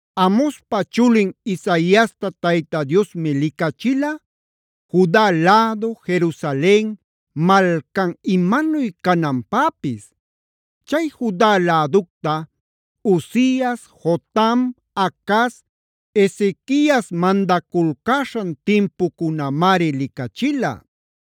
Amozpa chulin Isaiasta Tayta Diosmi licachilaa Juda lädu, Jerusalen malcan imanuy cananpäpis. Chay Juda läducta Uzias,b Jotam,c Acaz,d Ezequiase mandaculcäśhan timpucunamari licachila.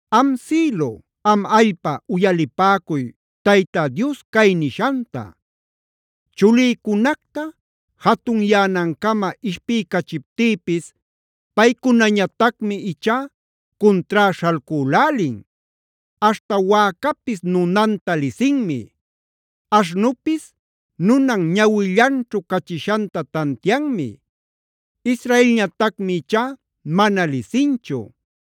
Am sïlu, am allpa uyalipäcuy Tayta Dios cay nishanta: “Chulïcunacta jatunyänancama ishpiycachiptïpis paycunañatacmi ichá cuntrá śhalcülälin. Aśhta wäcapis nunanta lisinmi; aśhnupis nunan ñawillanćhu cachishanta tantianmi. Israelñatacmi ichá mana lisinchu;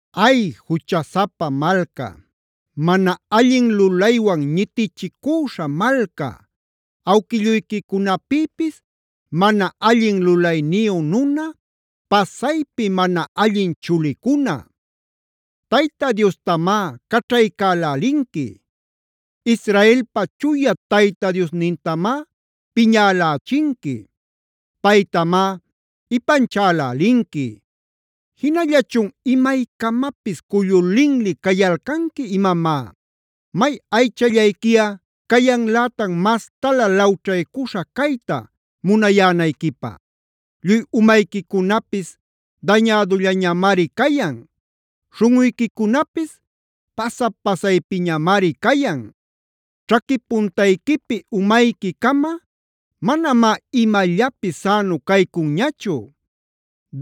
¡Ay, juchasapa malca, mana allin lulaywan ñitichicüśha malca, awquilluyquicunapïpis mana allin lulayniyu nuna, pasaypi mana allin chulicuna! Tayta Diostamá caćhaycälälinqui. Israelpa Chuya Tayta Diosnintamápiñälächinqui; paytamá ipanchalälinqui. ¿Jinallachun imaycamapis cullu linli cayalcanqui imamá? ¿May aychallayquiꞌa cayanlätan mastalä lawćhaycuśha cayta munayänayquipä? Lluy umayquicunapis dañädullañamari cayan; śhunꞌuyquicunapis pasa-pasaypiñamari cayan. Ćhaqui puntayquipi umayquicama, manamá imallapis sänu caycunñachu;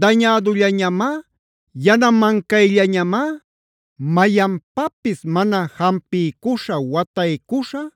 dañädullañamá, yanamancayllañamá, mayanpapis mana jampiycuśha wataycuśha,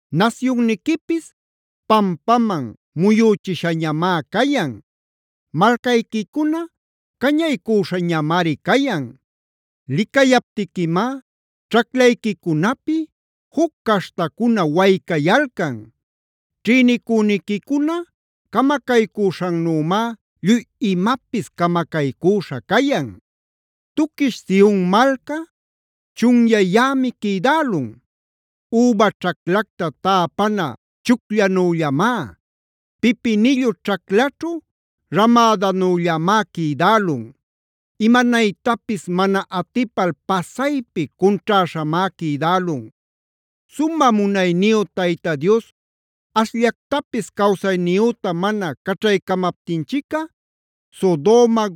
Nasyunniquipis pampaman muyüchishañamá cayan; malcayquicuna cañaycüśhañamari cayan. Licayaptiquimá ćhaclayquicunapi juc caśhtacuna waycayalcan; ćhïnicüniquicuna camacaycüśhannümá lluy imapis camacaycüśha cayan. Tuquish Sionh malca chunyayämi quïdälun. Üba ćhaclacta täpana chucllanüllamá, pipinillu ćhaclaćhu ramädanüllamá quïdälun; imanaytapis mana atipal pasaypi cunćhäśhamá quïdälun. Sumä munayniyu Tayta Dios ashllactapis cawsayniyüta mana caćhaycamaptinchicꞌa Sodoma,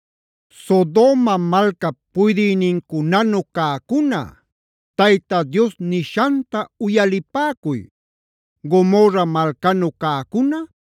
Sodoma malcap puydïnincunanu cäcuna, Tayta Dios nishanta uyalipäcuy. Gomorra malcanu cäcuna,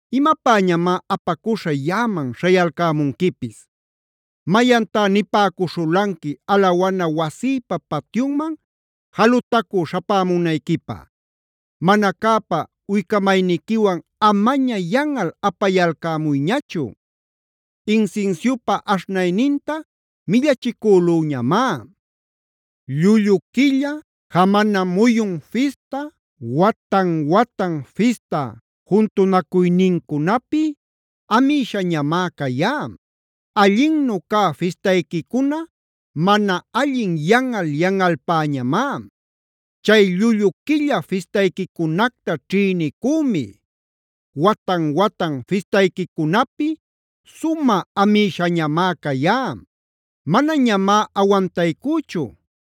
¿Imapäñamá apacuśha yaꞌaman śhayalcämunquipis? ¿Mayantá nipäcuśhulanqui alawana wasïpa patyunman jalutacü śhapämunayquipä? Mana cäpa uycamayniquiwan amaña yanꞌal apayalcämuyñachu. Insinsiupa aśhnayninta millachicülüñamá. Llullu quilla, jamana muyun fista, watan-watan fista juntunacuynincunapi amïshañamá cayá. Allinnu cä fistayquicuna mana allin yanꞌal-yanꞌalpäñamá. Chay llullu quilla fistayquicunacta ćhïnicümi; watan-watan fistayquicunapi sumä amïshañamá cayá. Manañamá awantaycüchu;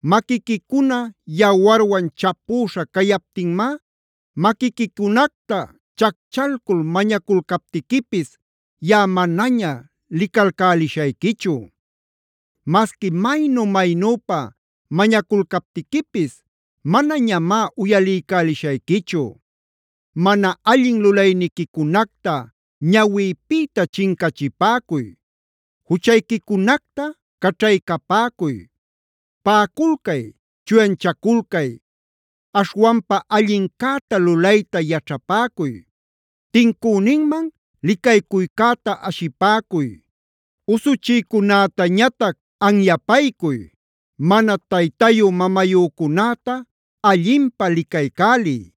Maquiquicuna yawarwan chapüśha cayaptinmá, maquiquicunacta chacchalcul mañaculcaptiquipis, yaꞌa manaña licalcälishayquichu. Masqui maynu-maynüpa mañaculcaptiquipis manañamá uyaliycälishayquichu. ¡Mana allin lulayniquicunacta ñawïpïta chincachipäcuy! ¡Juchayquicunacta caćhaycapäcuy! ¡Paꞌaculcay, chuyanchaculcay! Aśhwanpa allincäta lulayta yaćhapäcuy. Tincüninman licaycuycäta ashipäcuy; usuchïcunätañatac anyapaycuy. Mana taytayü-mamayücunäta allinpä licaycäliy;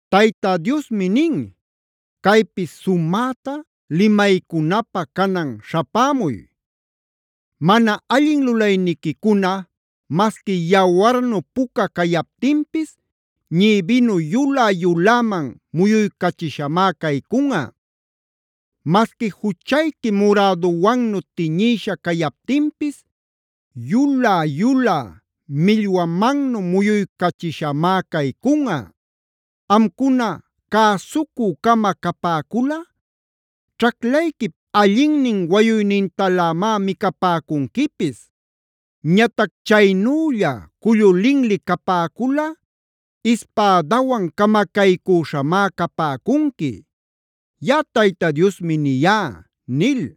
“Tayta Diosmi nin: ‘Caypi sumäta limaycunapä, canan śhapämuy. Mana allin lulayniquicuna masqui yawarnu puca cayaptinpis, ñïbinu yulä-yuläman muyuycachishamá caycunꞌa. Masqui juchayqui muräduwannu tiñïsha cayaptinpis yulä-yulä millwamannu muyuycachishamá caycunꞌa. Amcuna cäsucü-cama capäculꞌa, ćhaclayquip allinnin wayuynintalämá micapäcunquipis. Ñatac chaynülla cullu linli capäculꞌa ispädawan camacaycüśhamá capäcunqui. Yaꞌa Tayta Diosmi niyá’” nil.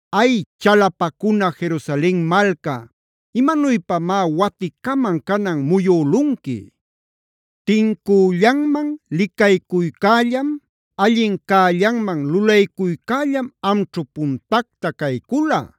¡Ay, chalapacuna Jerusalen malca, imanuypamá waticaman canan muyülunqui! Tincüllanman licaycuycällam, allin cällanman lulaycuycällam amćhu puntacta caycula;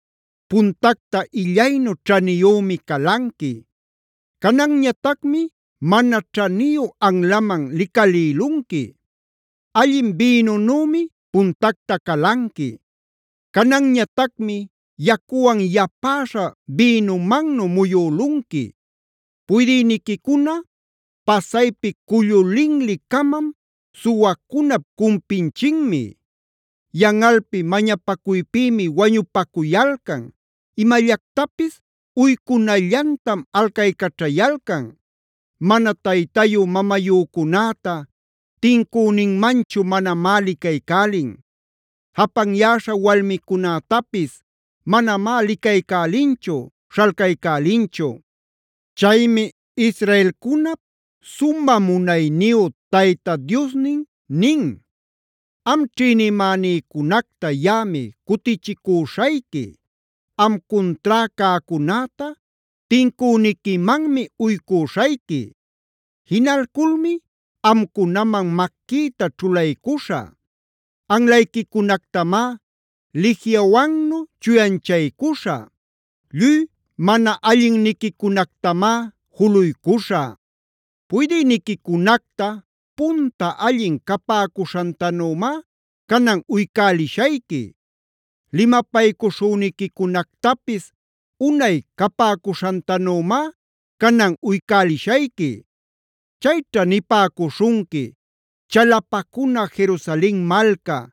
Puntacta illaynu ćhaniyümi calanqui; cananñatacmi mana ćhaniyu anlaman licalïlunqui. Allin bïnunümi puntacta calanqui; cananñatacmi yacuwan yapäśha bïnumannu muyülunqui. Puydïniquicuna pasaypi cullu linli-camam, suwacunap cumpinchinmi. Yanꞌalpi mañapacuypïmi wañupacuyalcan, imallactapis uycunallantam alcaycaćhayalcan. Mana taytayü-mamayücunäta tincüninmanchu manamá licaycälin; japanyäśha walmicunätapis manamá licaycälinchu, śhalcaycälinchu. Chaymi israelcunap sumä munayniyu Tayta Diosnin nin: “Am ćhïnimänïcunacta yaꞌami cutichicüśhayqui; am cuntrá cäcunäta tincüniquimanmi uycüśhayqui. Jinalculmi amcunaman maquïta ćhulaycuśhä; anlayquicunactamá lijiawannu chuyanchaycuśhä. Lluy mana allinniquicunactamá juluycuśhä. Puydïniquicunacta punta allin capäcuśhantanümá canan uycälishayqui; limapaycuśhüniquicunactapis unay capäcuśhantanümá canan uycälishayqui. Chayćha nipäcuśhunqui: ‘Chalapacuna Jerusalen malca;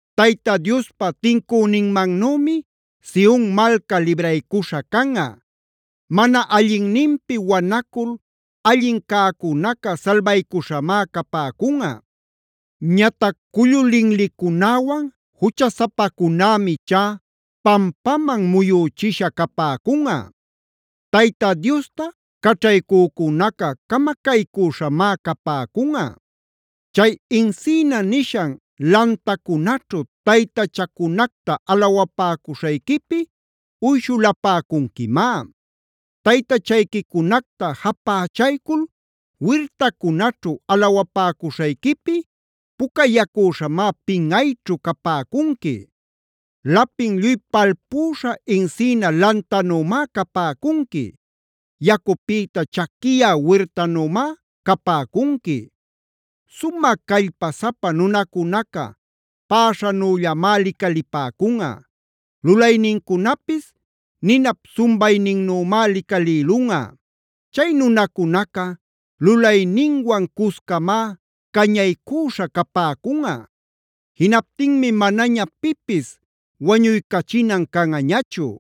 Tayta Diospa tincünïmannümi Sion malca libraycuśha canꞌa; mana allinninpi wanacul allin cäcunaca salbaycuśhamá capäcunꞌa. Ñatac cullu linlicunäwan juchasapacunämi ichá pampaman muyüchisha capäcunꞌa. Tayta Diosta caćhaycücunaca camacaycüśhamá capäcunꞌa. Chay encina nishan lantacunaćhu taytachacunacta alawapäcuśhayquipi uyshulapäcunquimá. Taytachayquicunacta japächaycul wirtacunaćhu alawapäcuśhayquipi, pucayacüśhamá pinꞌayćhu capäcunqui. Lapin lluy palpüśha encina lantanümá capäcunqui. Yacupïta chaquiyä wirtanümá capäcunqui. Sumä callpasapa nunacunaca päśhanüllamá licalipäcunꞌa; lulaynincunapis ninap sumbayninnümá licalïlunꞌa. Chay nunacunaca lulayninwan-cuscamá cañaycüśha capäcunꞌa; Jinaptinmi manaña pipis wañuycachinan canꞌañachu.